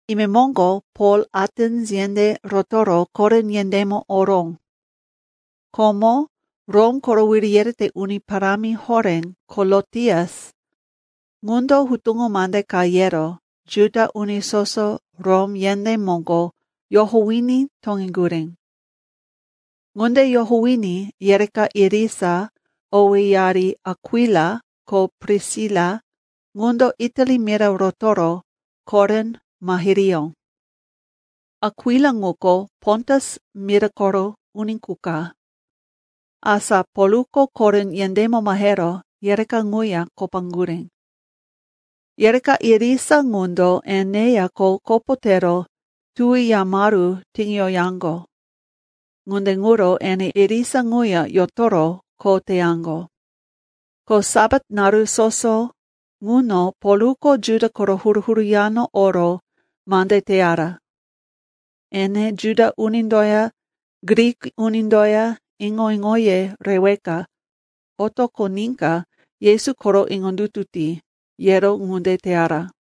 Imemoŋgo Pol Atens yendé rotoro Korin yendémo oró. Komo Rom koro wiri yerete uni parámi horé Kolotias ŋundo hutuŋo mande ka yero Juda uni soso Rom yendé moŋgo yohowiní toŋeŋgurí. Ŋunde yohowiní yereka irisa, owéyari Akwila, ko Prisila, ŋundo Itali mira rotoro Korin mahiriyó. Akwila ŋuko Pontus mira koro uni qu ka. Asa Polko Korin yendémo mahero yereka ŋuya kopaŋgurí. Yereka irisa ŋundo eneya kho kopo tero tuwi yamaru tiŋiyoyaŋgo. Ŋunde ŋuro ene irisa ŋuya yotoro kho teyaŋgo. Ko Sapat naru soso ŋuno Polko Juda koro huru-huru yano oro mande teyara. Ene, Juda unindoya Grik unindoya iŋo-iŋoye reweka otoqoníka Yesu koro iŋondutu ti, yero ŋunde teyara.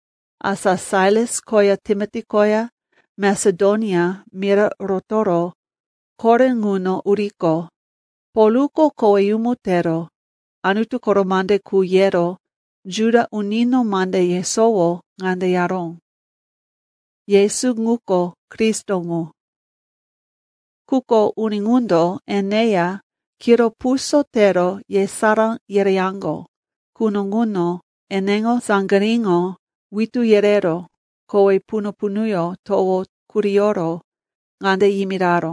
Asa Sailas koya Timoti koya Masedonia mira rotoro Korin ŋuno uriqo, Polko koweyumu tero Anutu koro mande qu yero Juda unino mande yesowo ŋande yaró, “Yesu ŋuko Kristo ŋu.” Quko uni ŋundo eneya kiro puso tero yesará yereyaŋgo quno ŋuno eneŋo saŋgiríŋo witú yerero kowe punu-punuyó towo kuriyoro ŋande yimiraró,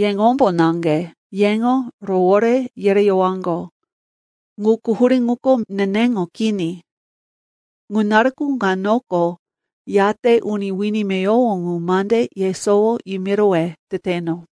“Yeŋombo naŋge yeŋo rowore yereyowaŋgo. Ŋu quhurí ŋuko neneŋo kini. Ŋa naruko ŋanoko yate uni wini meyowo ŋu mande yesowo yimirowe teteno.”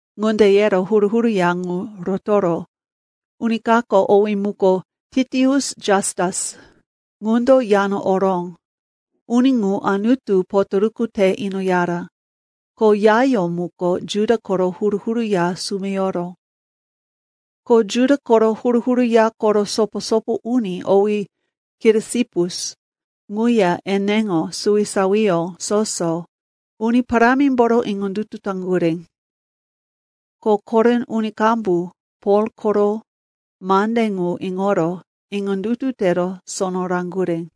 Ŋunde yero huru-huru ya ŋu rotoro, uni kako, owí muko Titius Jastus, ŋundo yano oró. Uni ŋu Anutu potoruku te inoyara. Ko yayó muko Juda koro huru-huru ya sumeyoro. Ko Juda koro huru-huru ya koro sopo-sopo uni, owí Kirisipus, ŋuya eneŋo suwisawiyó soso, Uni Parámimboro iŋondutu taŋgurí. Ko Korin uni qambu Pol koro mande ŋu iŋoro iŋondutu tero sono raŋgurí.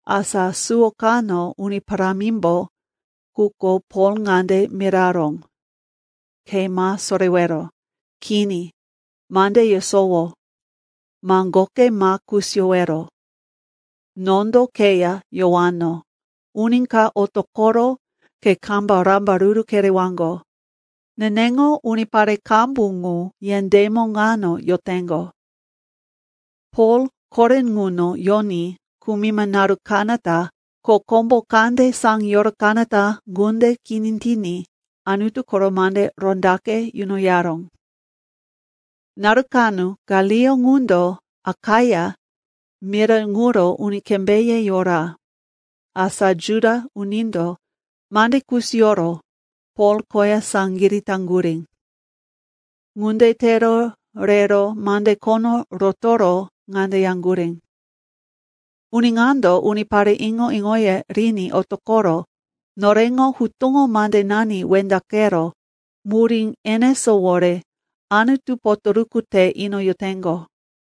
Asa suwo kano Uni Parámimbo quko Pol ŋande miraró, “Ke ma sorewero. Kini, mande yesowo; maŋgoke ma kusiyowero. Nondo keya yowano, uni ka otoqoro ke kama rambaruru kerewaŋgo. Neneŋo unipare qambu ŋu yendémo ŋano yoteŋgo.” Pol Korin ŋuno yoní kumima naru kanata ko kombo kande saŋiyoro kanata ŋunde kini tiní Anutu koro mande rondaqe yunoyaró. Naru kano Galio ŋundo Akaia mira ŋuro uni kembéye yora. Asa Juda unindo mande kusiyoro Pol koya saŋgirí taŋgurí. Ŋunde tero rero mande khono rotoro ŋande yaŋgurí, “Uni ŋando unipare iŋo-iŋoye riní otoqoro noreŋo hutuŋo mandenani wendaqero murí enesówore Anutu potoruku te inoyoteŋgo.”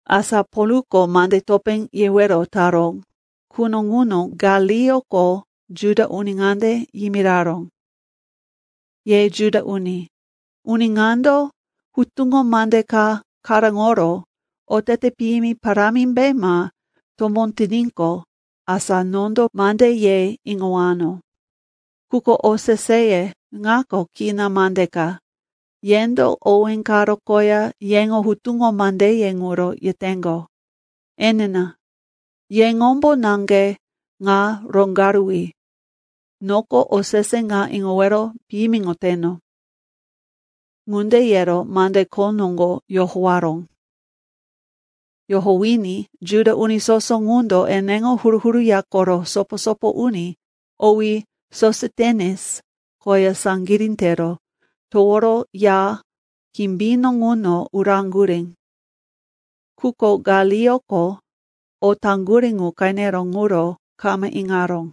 Asa Polko mande topé yewero taró quno ŋuno Galioko Juda uni ŋande yimiraró, “Ye Juda uni, uni ŋando hutuŋo mande ka karóŋoro otete piyimi parámimbe ma tomó tiníqo, asa nondo mande ye iŋowano. Quko oseseye ŋako kina mande ka, yendo owé karo koya yeŋo hutuŋo mandeye ŋuro yeteŋgo. Enina, yeŋombo naŋge ŋa roŋgaruwi. Noko osese ŋa iŋowero piyimiŋoteno.” Ŋunde yero mande kho noŋgo yohowaró. Yohowiní Juda uni soso ŋundo eneŋo huru-huru ya koro sopo-sopo uni, owí Sositenes koya saŋgirí tero toworo ya kimbino ŋuno uraŋgurí. Quko Galioko o taŋgurí ŋu qenero ŋuro kama iŋaró.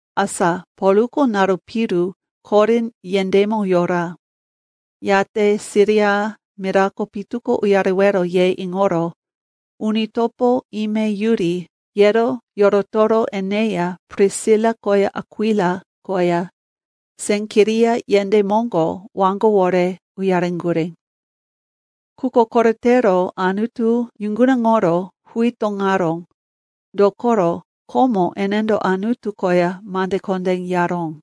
Asa Polko naru piru Korin yendémo yora. Yate Siria mirako pitu ko uyarewero ye iŋoro uni topo, ime yuri, yero yorotoro eneya Prisila koya Akwila koya Senkiria yendé moŋgo waŋgowore uyareŋgurí. Quko koretero Anutu yuŋgunaŋoro huí toŋaró, dokoro komo enendo Anutu koya mande kondé yaró.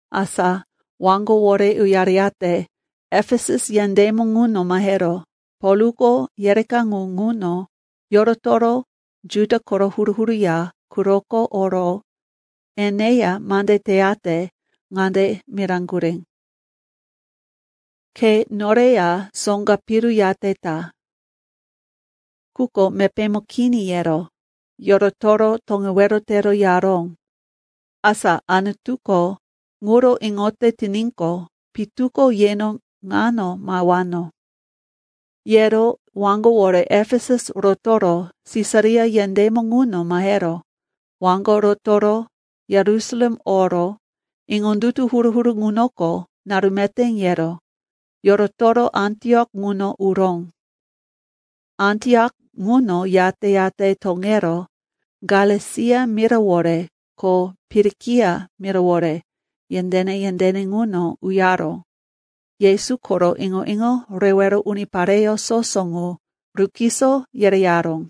Asa waŋgowore uyareyate Efesus yendémo ŋuno mahero Polko yereka ŋu ŋuno yorotoro Juda koro huru-huru ya quroko oro eneya mande teyate ŋande miraŋgurí, “Ke noreya soŋga piru yate ta.” Quko, “Mepémo kini,” yero yorotoro toŋewero tero yaró, “Asa Anutuko ŋuro iŋote tiníqo, pitu ko yeno ŋano mahewano.” Yero waŋgowore Efesus rotoro Sisaria yendémo ŋuno mahero waŋgo rotoro Yerusalem oro iŋondutu huru-huru ŋunoko naru meté yero yorotoro Antiok ŋuno uró. Antiok ŋuno yate-yate toŋero Galesia mirawore ko Pirikia mirawore yendéne-yendéne ŋuno uyaro Yesu koro iŋo-iŋo rewero unipareyó soso ŋu rukiso yereyaró.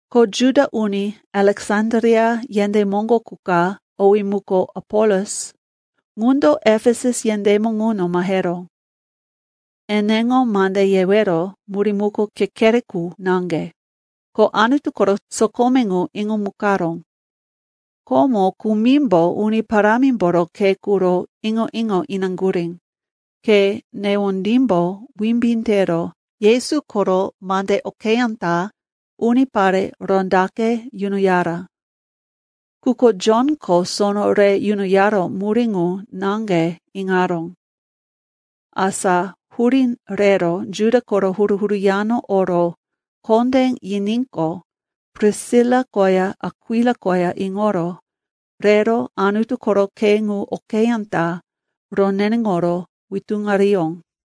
Ko Juda uni Aleksandria yendé moŋgo qu ka, owí muko Apolos, ŋundo Efesus yendémo ŋuno maheró. Eneŋo mande yewero murí ŋuko kekere qu naŋge, ko Anutu koro sokome ŋu iŋomukaró. Komo kumimbo Uni Parámimboro khe quro iŋo-iŋo inaŋgurí, ko newondímbo wimbí tero Yesu koro mande okeyá ta unipare rondaqe yunoyara. Quko Jonko sono re yunoyara murí ŋu naŋge iŋaró. Asa hurí rero Juda koro huru-huru yano oro kondé yiníqo, Prisila koya Akwila koya iŋoro rero Anutu koro khe ŋu okeyá ta roneneŋoro witúŋariyó.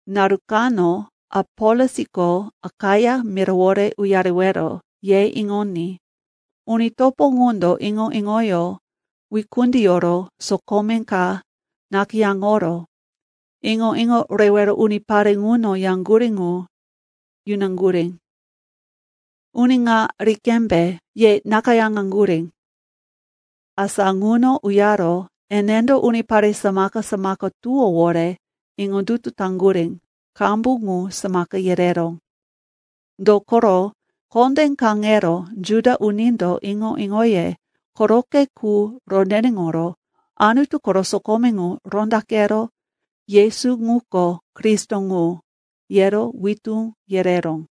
Naru kano Apolosko Akaia mirawore uyarewero ye iŋoní uni topo ŋundo iŋo-iŋoyó wikundiyoro sokome ka nakayáŋoro iŋo-iŋo rewero unipare ŋuno yaŋgurí ŋu yunaŋgurí. Uni ŋa ri qembe, ye nakayáŋaŋgurí. Asa ŋuno uyaro enendo unipare samaka-samaka tuwówore iŋondutu taŋgurí qambu ŋu samaka yereró. Dokoro kondé kaŋero Juda unindo iŋo-iŋoye koroqe qu roneneŋoro Anutu koro sokome ŋu rondaqero, Yesu ŋuko Kristo ŋu, yero witú yereró.